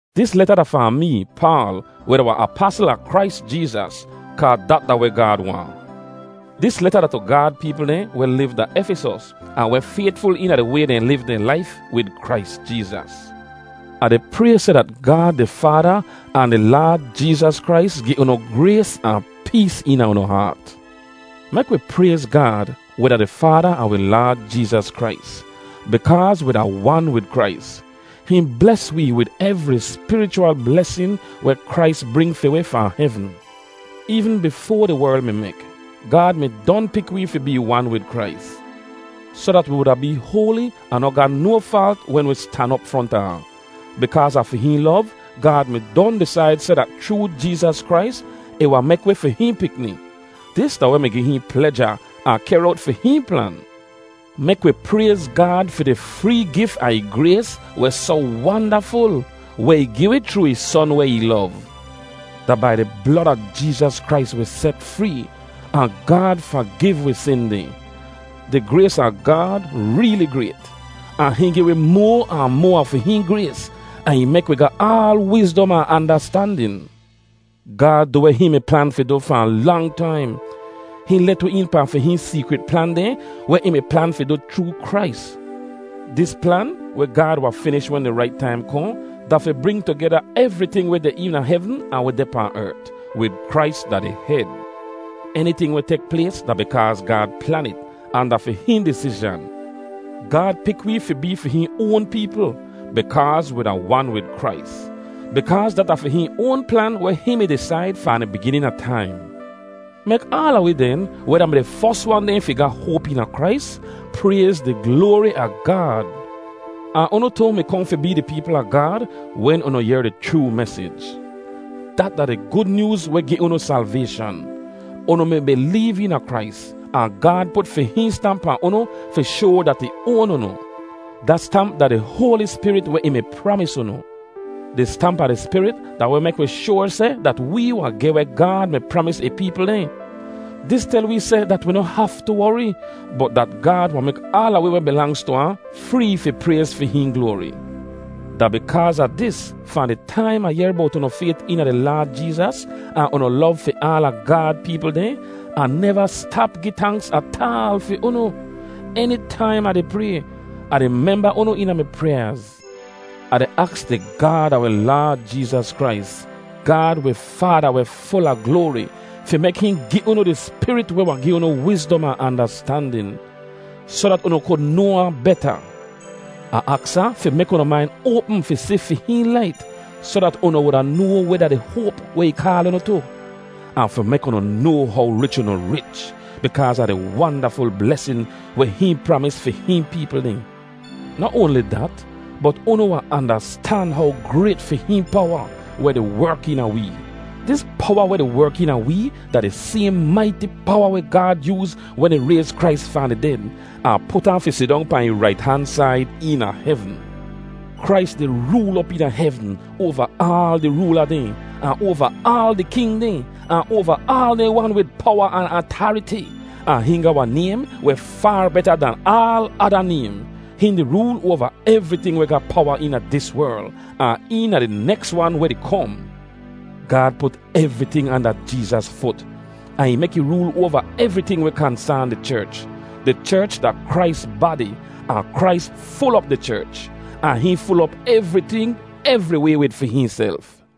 Dis leta da fahn mee, Paal, weh da wahn apasl a Krais Jeezas, kaa dat da weh Gaad waahn. Dis leta da tu Gaad peepl dehn weh liv da Efisos, ahn weh faytful eena di way dehn liv dehn laif wid Krais Jeezas. Ah di pray seh dat Gaad di Faada ahn di Laad Jeezas Krais gi unu grays ahn pees eena unu haat. Mek wi prayz Gaad, weh da di Faada a wi Laad Jeezas Krais! Bikaaz wi da wan wid Krais, hihn bles wee wid evri spirichwal blesin weh Krais bring fi wi fahn hevn. Eevn bifoa di werl mi mek, Gaad mi don pik wee fi bee wan wid Krais, soh dat wi wuda bee hoali ahn noh ga no faalt wen wi stan op fronta ahn. Bikaaz a fi hihn lov, Gaad mi don disaid seh dat chroo Jeezas Krais, ih wahn mek wi fi hihn pikni. Dis da weh mi gi hihn pleja, ahn kehr owt fi hihn plan. Mek wi prayz Gaad fi di free gif a ih grays weh soh wandaful, weh ih gi wi chroo ih Son weh ih lov. Da bai di blod a Jeezas Krais wi set free, ahn Gaad fagiv wi sin dehn. Di grays a Gaad reeli grayt! Ahn hihn gi wi moa ahn moa a fi hihn grays, ahn ih mek wi ga aal wizdom ahn andastandin. Gaad du weh hihn mi plan fi du fahn lang taim. Hihn let wi een pahn fi hihn seekrit plan dehn weh ih mi plan fi du chroo Krais. Dis plan, weh Gaad wahn finish wen di rait taim kohn, da fi bring tugeda evriting weh deh eena hevn ahn weh deh pahn ert, wid Krais da di hed. Eniting weh tek plays da bikaaz Gaad plan it, ahn da fi hihn disizhan. Gaad pik wee fi bee fi hihn oan peepl, bikaaz wi da wan wid Krais, bikaaz dat da fi hihn oan plan weh hihn mi disaid fahn di biginin a taim. Mek aala wi den, weh da-mi di fos wan dehn fi ga hoap eena Krais, prayz di gloari a Gaad! Ahn unu tu mi kohn fi bee di peepl a Gaad wen unu yehr di chroo mesij. Dat da di Gud Nyooz weh gi unu salvayshan. Unu mi bileev eena Krais, ahn Gaad put fi hihn stamp pahn unu fi shoa dat ih oan unu. Da stamp da di Hoali Spirit weh ih mi pramis unu. Di stamp a di Spirit da weh mek wi shoar seh dat wee wahn geh weh Gaad mi pramis ih peepl dehn. Dis tel wee seh dat wi noh haftu wori, bot dat Gaad wahn mek aala wi weh bilangz tu ahn free fi prayz fi hihn gloari! Da bikaaz a dis, fahn di taim Ah yehr bowt unu fayt eena di Laad Jeezas ahn unu lov fi aala Gaad peepl dehn, Ah neva stap gi tanks ataal fi unu. Enitaim Ah di pray, Ah di memba unu eena mi pryaaz. Ah di aks di Gaad a wi Laad Jeezas Krais, Gaad wi Faada weh ful a gloari, fi mek hihn gi unu di Spirit weh wahn gi unu wizdom ahn andastandin, soh dat unu kud noa ahn beta. Ah aks ahn fi mek unu main oapm fi si fi hihn lait, soh dat unu wuda noa weh da di hoap weh ih kaal unu tu. Ahn fi mek unu noa how rich unu rich, bikaaz a di wandaful blesin weh hihn pramis fi hihn peepl dehn. Noh oanli dat, bot unu wahn andastan how grayt fi hihn powa, weh di werk eena wee. Dis powa weh di werk eena wee da di sayhn maiti powa weh Gaad yooz wen ih rayz Krais fahn di ded, ahn put ahn fi sidong pahn ih rait han said eena hevn. Krais di rool op eena hevn oava aal di roola dehn, ahn oava aal di king dehn, ahn oava aal dehn wan wid powa ahn atariti. Ahn hihn ga wahn naym weh faar beta dahn aal ada naym. Hihn di rool oava evriting weh ga powa eena dis werl, ahn eena di neks wan weh di kom. Gaad put evriting anda Jeezas fut, ahn ih mek ih rool oava evriting weh kansaan di cherch. Di cherch da Krais badi, ahn Krais ful op di cherch. Ahn hihn ful op evriting, evriway wid fi hihnself.